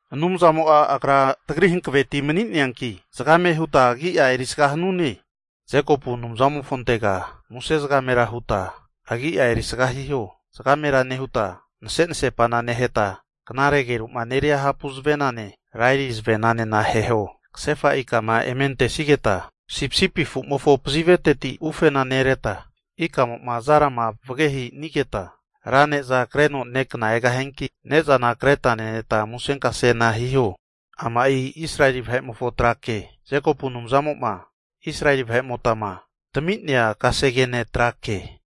Anumzamo'a Agra tagri hankaveti mani'neanki zagame huta agi'a erisga hanune. Jekopu Anumzamofontega muse zagamera huta agi'a erisga hiho? Zgamera nehuta nasenasepana neheta, knare ageru'ma neria hapu zavenane laeri zavenanena aheho. Kasefa ikama eme antesigeta sipisipi afu'mofo paziveteti ufena nereta, ikamo'ma zarama vagehinigeta, ra ne'za kreno nekna egahianki, ne'zana kreta neneta musenkase hiho. Ama'i Israeli vahe'mofo trake, Jekopu Anumzamo'ma Israeli vahe'motama tami'nea kasegene trake.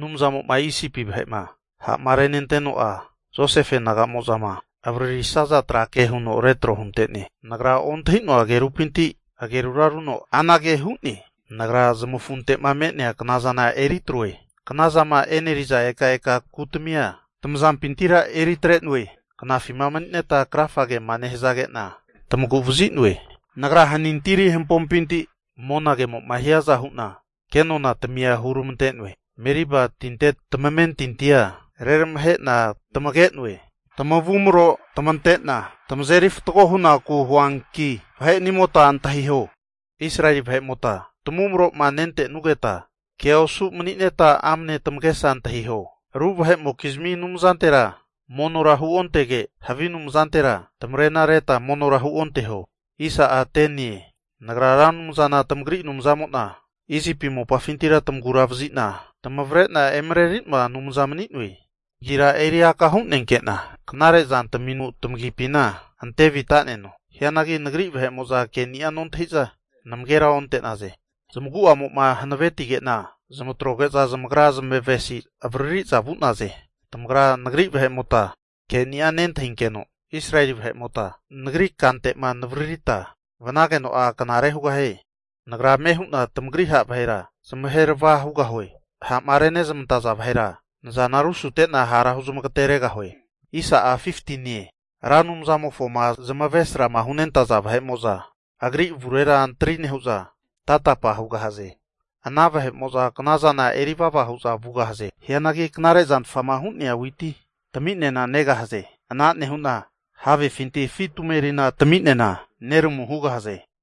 Anumzamo'ma Isipi vahe'ma ha'ma renenteno'a, Josefe naga'mozama avaririsaza trake huno retro hunte'ne. Nagra ontahi'noa agerupinti agerura runo anage hu'ne, Nagra zamafunte'ma me'nea knazana eri atroe. Kna zama e'neriza ekaeka kutamia tamazampintira eri atre'noe. Knafima mani'neta krafa nehazagena, tamagu'vazi'noe. Nagra hanintiri hampompinti monagema hiaza hu'na kenonatamia huramante'noe. Meriba tinte tamamentintia reramahe'na tamage'noe. Tamavumro tamantena tamazeri fatgo hunaku huanki, vahe'nimota antahiho! Israeli vahe'mota tamavumro'ma nentenugeta kea osu mani'neta amne tamagesa antahiho. Ru vahe'mokizmi anumzantera monora huontege, havi anumzantera tamarena reta monora huonteho. Nagra Ra Anumzana tamagri Anumzamo'na Isipi mopafintira tamagura vazi'na tamavre'na emareri'noa Anumza mani'noe. Tamagira eri aka hunenke'na knare zantaminura tamagipina ante vita'neno. Hianagi nagri vahe'mo'za keni'a nontahi'za, namagera onte'naze. Zamagu'amo'ma hanavetige'na zamatroge'za zamagra zamavesi avariri'za vu'naze. Tamagra nagri vahe'mota keni'a nentahinkeno, Israeli vahe'mota nagri kante'ma navaririta vanageno'a knare hugahie. Nagra ame hu'na tamagri ha' vahera zamahe rava hugahue. Ha'ma renezmantaza vahera nazana rusute'na hara huzmagateregahue. Ra Anumzamofoma zamavaresrama hunentaza vahe'mo'za agri avurera antri nehu'za tatapa hugahaze. Ana knazana eri vava hu'za vugahaze. Hianagi knare zantfama hu'nea witi tami'nena negahaze. Ana nehu'na havefinti afi tumeri taminena neramu hugahaze.